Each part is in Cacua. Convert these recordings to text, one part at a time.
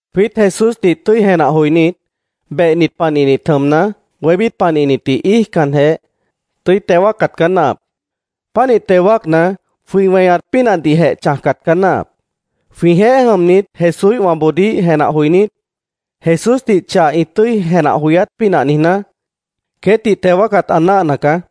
Jwiít Jesúsdih tʉ́i jenah joinít, behnit panihnit jʉmna, wébít panihnitdih íijcanjeh, tʉ́i teo wáacat caá náahap. Pánih teo wáacna, jwĩ weñat pínahdihjeh chãjcat caá náahap. Jwĩjeéh jʉmnit Jesúíhwãboodíh jenah joinít, Jesúsdih chah ĩ tʉ́i jenah joyát pínah niijná, queétdih teo wáacat ã náahna caá.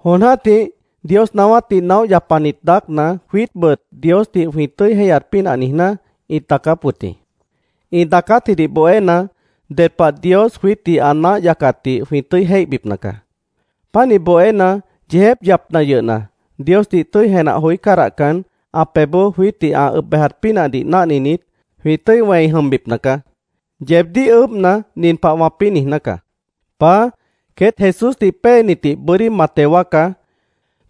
Jon jã́tih Dios naáwátdih naóh yapanit daácna, jwiítbʉt Diosdih jwĩ tʉ́i jéihyat pínah niijná, ĩt daacáp wʉt jĩ. Ĩ daacátjidih bohéna, ded pah Dios jwiítdih ã náah yacatdih jwĩ tʉ́i jéihbipna caá. Pánih bohéna, yeejép yapna yʉhna, Diosdih tʉ́i jenah joí cádahcan, ã pebhboó jwiítdih ã ʉb bejat pínahdih náhninit, jwĩ tʉ́i wẽi jʉmbipna caá. Yeebdíh ʉʉ́bhna, nin pah wãpĩ́ niijná caá: “Paá, queét Jesúsdih péenitdih bʉ́dí ma teo wáacá,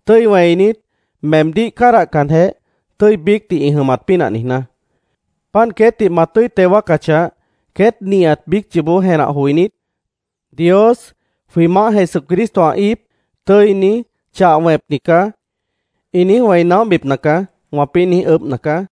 tʉ́i wẽinit, meemdíh cádahcanjeh, tʉ́i biícdih ĩ jʉmat pínah niijná. Páant queétdih ma tʉ́i teo wáacachah, queét nihat biíc yoobó jenah joinít, ‘Dios, jwĩ Maáh Jesucristo ã íip, tʉ́ini, chah wẽpni caá’, ĩ niíj wẽi naóhbipna caá”, wãpĩ́ niíj ʉʉ́bhna caá.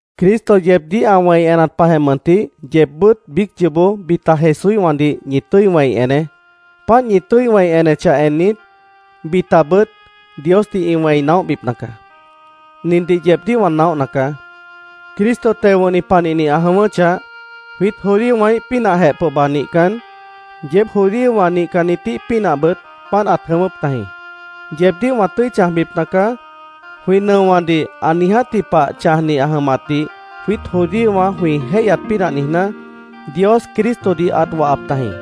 Cristo yeebdíh ã wẽi enat pahjeh mʉntih, yeebbʉ́t biíc yoobó bita Jesúíhwãdih ñi tʉ́i wẽi eneé. Páant ñi tʉ́i wẽi enechah ennit, bitabʉt Diosdih ĩ wẽi naóhbipna caá. Nindih yeebdíh wã naóhna caá: Cristo teo wʉ̃hni panihni ã jʉ̃ʉ́wʉ́chah, jwiít judíowãíh pínahjeh pohba nihcan, yeéb judíowã nihcannitíh pínahbʉt páant ãt jʉ̃ʉ́wʉ́p tajĩ. “Yeebdíh wã tʉ́i chãjbipna caá”, jwĩ nʉowãdih ã niijátji pah chãjni ã jʉmatdih jwiít judíowã jwĩ jéihyat pínah niijná, Dios Cristodih ãt wahap tajĩ.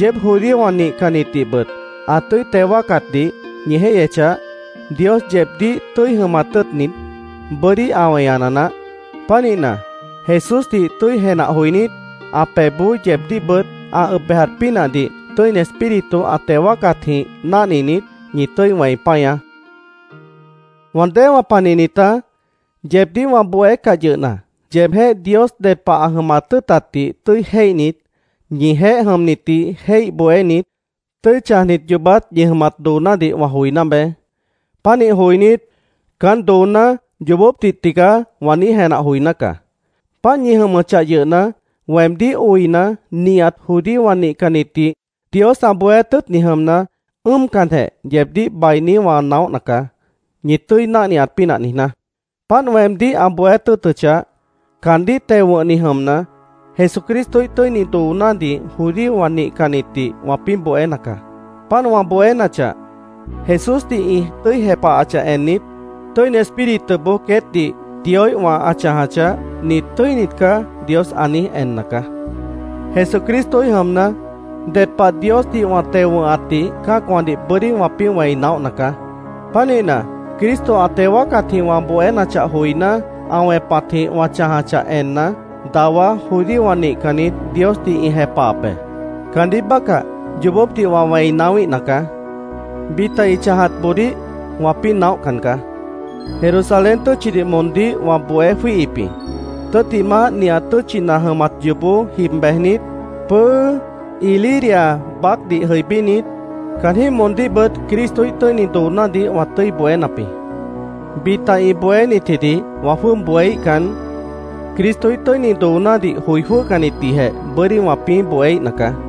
Yeéb judíowã nihcannitdihbʉt ã tʉ́i teo wáacatdih ñi jéihyechah, Dios yeebdíh tʉ́i jʉmat tʉ́ʉtnit, bʉ́dí ã weñana naáh. Pánihna, Jesúsdih tʉ́i jenah joinít, ã pebhboó yeebdíhbʉt ã ʉb bejat pínahdih Tʉ́ini Espíritu ã teo wáacatjĩh náhninit, ñi tʉ́i wẽi páñaá. Wã déewã panihnitá, yeebdíh wã bohécah yʉhna, yeebjéh Dios ded pah ã jʉmat tʉ́ʉtatdih tʉ́i jéihnit, ñijeéh jʉmnitdih jéih bohénit, tʉ́i chãjnit yoobát ñi jʉmat doonádih wã joiná beé. Pánih joinít, “Caán dooná yoobópdih tigaá”, wã niíj jenah joiná caá. Páant ñi jʉmʉchah yʉhna, weemdíh oina, nihat judíowã nihcannitdih Dios ã bohéát tʉ́ʉtni jʉmna, ʉ́ʉmcanjeh yeebdíh bainí wã naóhna caá, ñi tʉ́i náhniat pínah niijná. Páant weemdíh ã bohéát tʉ́ʉtʉchah, caandíh teo wʉ̃hni jʉmna, Jesucristoíh tʉ́ini doonádih judíowã nihcannitdih wãpĩ́ bohéna caá. Páant wã bohénachah, Jesúsdih ĩ tʉ́i jepahachah ennit, Tʉ́ini Espírituboó queétdih Dioíhwã ã chãjachah, “Nit tʉ́init caá”, Dios ã niíj enna caá. Jesucristoíh jʉmna, ded pah Diosdih wã teo wʉ̃hatdih cã́acwãdih bʉ́dí wãpĩ́ wẽi naóhna caá. Pánihna, Cristo ã teo wáacatjĩh wã bohénachah joiná, ã wẽpatjĩh wã chãjachah enna, dawá judíowã nihcannit Diosdih ĩ jepahap be. Caandíh bácah yoobópdih wã wẽi naáwíhna caá. Bita ĩ chãjatboodíh wãpĩ́ naóhcan caá. Jerusalén tʉ́tchidih moondíh wã bohé jwíihip jĩ. Tʉ́ttimah, nihat tʉ́tchina jʉmat yoobó jib bejnit, pʉ́ʉ́ Iliria baácdih jʉibínit, caanjĩ́h moondíhbʉt Cristoíh tʉ́ini doonádih wã tʉ́i bohénap jĩ. Bita ĩ bohénitjidih wã jwʉ́ʉb bohéíhcan, Cristoíh tʉ́ini doonádih joi jwʉ́hcannitdihjeh bʉ́dí wãpĩ́ bohéíhna caá.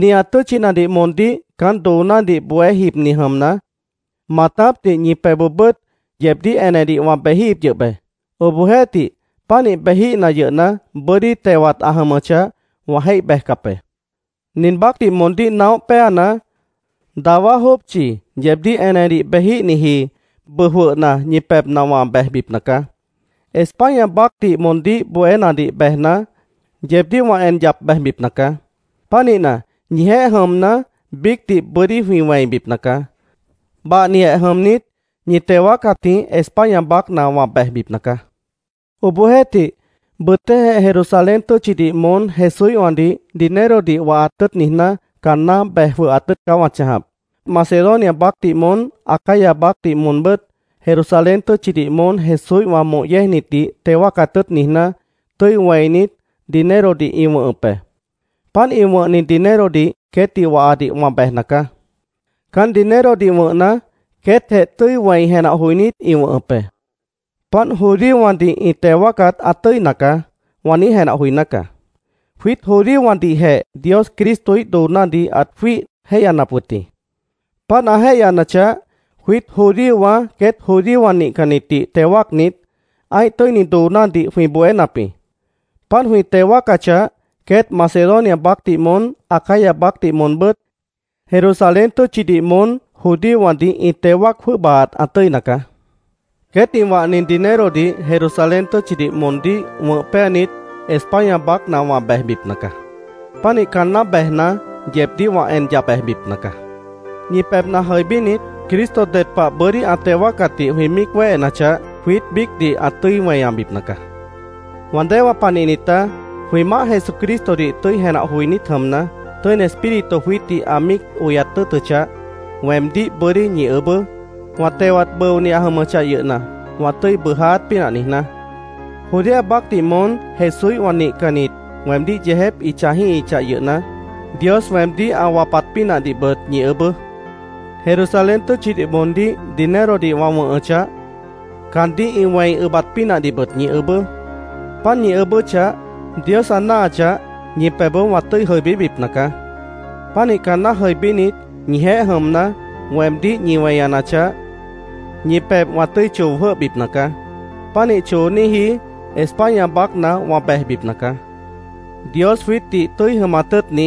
Nihat tʉ́tchinadih moondíh caán doonádih bohé jibni jʉmna, maatápdih ñi pebhboobʉ́t yeebdíh enedih wã bejíhip yʉh be. Obohjeéhtih, pánih bejíhna yʉhna, bʉ́dí tewat ã jʉmʉchah, wã jéih bejcap be. Nin baácdih moondíh naóh péana, dawá jópchi yeebdíh enedih bejíhniji bʉʉ jwʉhna ñi pebhna wã bejbipna caá. España baácdih moondíh bohénadih bejna, yeebdíh wã en yap bejbipna caá. Pánihna, ñijeéh jʉmna, biícdih bʉ́dí jwĩ wẽibipna caá. Bahnijeh jʉmnit, ñi teo wáacatjĩh España baácna wã bejbipna caá. Obohjeéhtih, bʉtéhjeh Jerusalén tʉ́tchidih moón Jesúíhwãdih dinerodih wahat tʉ́ʉt niijná, caanná bej jwʉhat tʉ́ʉt caá wã chãjap. Macedonia baácdih moón, Acaya baácdih moonbʉ́t Jerusalén tʉ́tchidih moón Jesúíhwã moh yéejnitdih teo wáacat tʉ́ʉt niijná, tʉ́i wẽinit, dinerodih ĩ wʉ̃hʉp be. Páant ĩ wʉ̃hni dinerodih queétdih wahadih wã bejna caá. Caán dinerodih wʉ̃hna, queétjeh tʉ́i wẽi jenah joinít, ĩ wʉ̃hʉp be. “Páant judíowãdih ĩ teo wáacat ã tʉ́ina caá”, wã niíj jenah joiná caá. Jwiít judíowãdihjeh Dios Cristoíh doonádih ãt jwíih jéihyanap wʉt jĩ. Páant ã jéihyanachah, jwiít judíowã queét judíowã nihcannitdih teo wáacnit, ã́ih tʉ́ini doonádih jwĩ bohénap jĩ. Páant jwĩ teo wáacachah, queét Macedonia baácdih moón Acaya baácdih moonbʉ́t Jerusalén tʉ́tchidih moón judíowãdih ĩ teo wáac jwʉ́ʉbaat ã tʉ́ina caá. Queét ĩ wahni dinerodih Jerusalén tʉ́tchidih moondíh wʉ̃h péanit, España baácna wã bejbipna caá. Pánih caanná bejna, yeebdíh wã en yap bejbipna caá. Ñi pebhna jʉibínit, Cristo ded pah bʉ́dí ã teo wáacatdih jwĩ míic wéhenachah, jwiít biícdih ã tʉ́i weñabipna caá. Wã déewã panihnitá, jwĩ Maáh Jesucristodih tʉ́i jenah joinít jʉmna, Tʉ́ini Espíritu jwiítdih ã míic oyat tʉ́ʉtʉchah, weemdíh bʉ́dí ñi ʉʉ́bʉ́, wã tewat bʉoni ã jʉmʉchah yʉhna, wã tʉ́i bʉʉjáát pínah niijná. Judea baácdih moón Jesúíhwã nihcannit weemdíh yeejép ĩ chãjíhichah yʉhna, Dios weemdíh ã wapat pínahdihbʉt ñi ʉʉ́bʉ́. Jerusalén tʉ́tchidih moondíh dinerodih wã wʉ̃hʉchah, caandíh ĩ wẽi ʉbat pínahdihbʉt ñi ʉʉ́bʉ́. Páant ñi ʉʉ́bʉ́chah, Dios ã náahachah, ñi pebhboó wã tʉ́i jʉibíbipna caá. Pánih caanná jʉibínit, ñijeéh jʉmna, weemdíh ñi weñanachah, ñi pebh wã tʉ́i choo jwʉ́hbipna caá. Pánih chooníji España baácna wã bejbipna caá. Dios jwiítdih tʉ́i jʉmat tʉ́ʉtni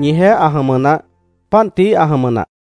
ñijeéh ã jʉmʉ naáh. Páant tií ã jʉmʉ nah.